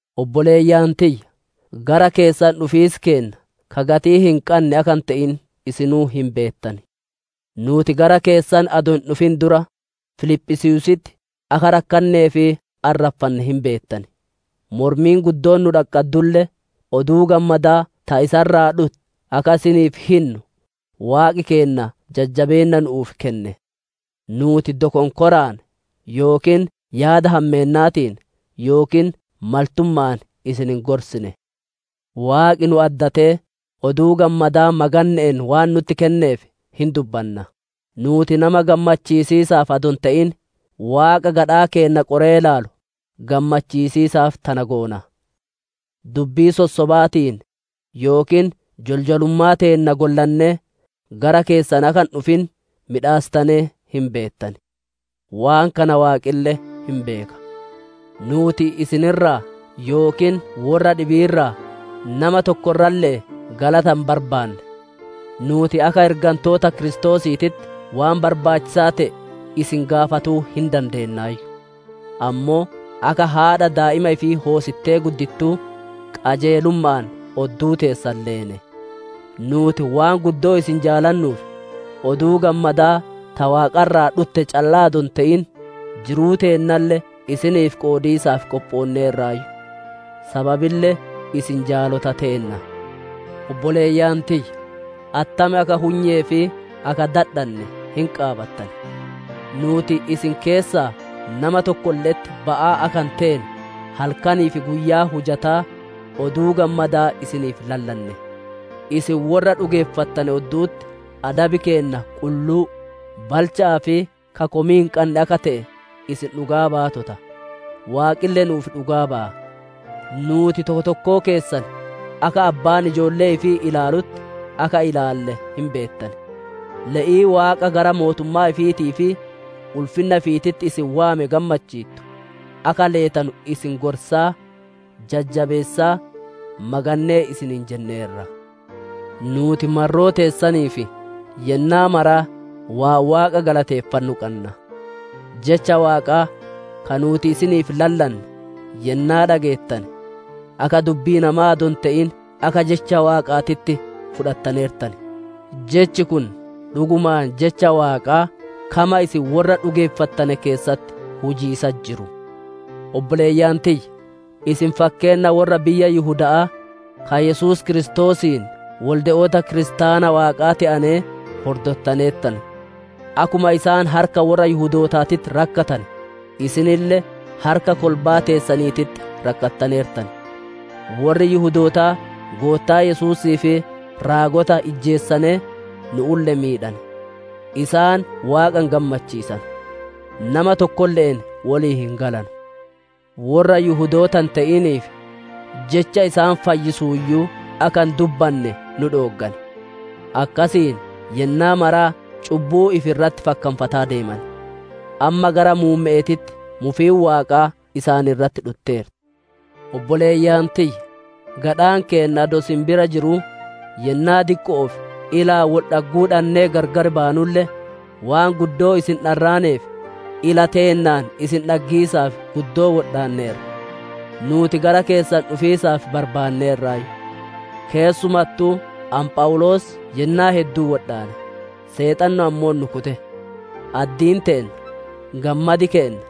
Obboleeyyan tiyya, gara keessan dhufiis keenna ka gatii hin qanne akka hin te'in isinuu hin beettan. Nuuti gara keessan adoo hin dhufin dura, Filiphisiiyuusitti akka rakkannee fi arraffanne hin beettan. Mormiin guddoon nu dhaqqaddulle, Oduu Gammadaa ta isa irraa dhutte akka isiniif hinnu Waaqi keenna jajjabeenna nu'uuf kenne. Nuuti dokonkoraan, yookiin yaada hammeennaatiin, yookiin maltumma'aan isin hin gorsine. Waaqi nu addatee, Oduu Gammadaa maganne'een waan nutti kenneef hin dubbanna. Nuuti nama gammachiisiisaaf adoo hin te'in, Waaqa gadhaa keenna qoree ilaalu, gammachiisiisaaf tana goona. Dubbii sossobaatiin, yookiin joljolummaa teenna gollannee gara keessan akka hin dhufin miidhassitanee hin beettan! Waan kana Waaqille hin beeka. Nuuti isin irraa yookiin worra dhibii irraa, nama tokko irralle'ee galata hin barbaanne. Nuuti akka ergantoota Kiristoosiititti waan barbaachisaa te'e isin gaafatuu hin dandeennaayyu. Ammoo akka haadha daa'ima ifii hoosittee guddittuu, qajeelumma'aan odduu teessan leene. Nuuti waan guddoo isin jaalannuuf, Oduu Gammadaa ta Waaqa irraa dhutte callaa adoo hin te'in, jiruu teennalle isiniif qoodiisaaf qophoonneerraayyu. Sababille isin jaalota teenna! Obboleeyyan tiyya, attam akka hunyee fi akka dadhanne hin qaabattan. Nuuti isin keessaa nama tokkolle'etti ba'aa akka hin teene, halkanii fi guyyaa hujataa, Oduu Gammadaa isiniif lallanne. Isin worra dhugeeffattane oddu'utti adabi keenna qulluu, balcha'aa fi ka komii hin qanne akka te'e isin dhugaa baatota; Waaqille nuuf dhugaa baya. Nuuti tokko tokkoo keessan, akka abbaan ijoollee ifii ilaalutti, akka ilaalle hin beettan. Le'ii Waaqa gara mootummaa ifiitii fi ulfinna ifiititti isin waame gammachiittu akka leetanu isin gorsaa, jajjabeessaa, magannee isiniin jenneerra. Nuuti marroo teessaniif yennaa maraa waan Waaqa galateeffannu qanna. Jecha Waaqaa, ka nuuti isiniif lallanne yennaa dhageettane, akka dubbii namaa adoo hin te'in akka jecha Waaqaatitti fudhattaneertan; jechi kun dhugumaan jecha Waaqaa, kama isin worra dhugeeffattane keessatti hujiisatti jiru. Obboleeyyan tiyya, isin fakkeenna worra biyya Yihuda'aa, ka Yesuus Kiristoosiin wolde'oota kiristaana Waaqaa te'anee hordottaneertan. Akkuma isaan harka worra Yihudootaatitti rakkatane, isinille harka kolbaa teessaniititti rakkattaneertan. Worri Yihudootaa Goottaa Yesuusii fi raagota ijjeesanee, nu'ulle miidhane. Isaan Waaqa hin gammachiisanu, nama tokkolle'een wolii hin galanu. Worra Yihudoota hin te'iniif, jecha isaan fayyisuuyyuu akka hin dubbanne nu dhooggan. Akkasiin yennaa maraa cubbuu ifi irratti fakkanfataa deeman. Amma gara muumme'eetitti mufiin Waaqaa isaan irratti dhutteerti. Obboleeyyan tiyya, gadhaan keenna adoo isin bira jiruu, yennaa diqqo'oof ilaan wol dhagguu dhannee gargar baanulle, waan guddoo isin dharraaneef ila teennaan isin dhaggiisaaf guddoo wodhaanneerra. Nuuti gara keessan dhufiisaaf barbaanneerraayyu. Keessumattuu ani Phawuloos yennaa hedduu wodhaane; Seexanni ammoo nu kute. Addiin teenna, gammadi keenna,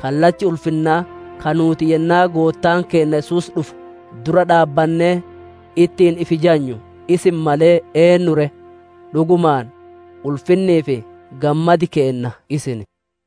kallachi ulfinnaa ka nuuti Yennaa Goottaan keenna Yesuus dhufu dura dhaabbannee, ittiin ifi jajnu isin malee eennu ree? Dhugumaan, ulfinnii fi gammadi keenna isin.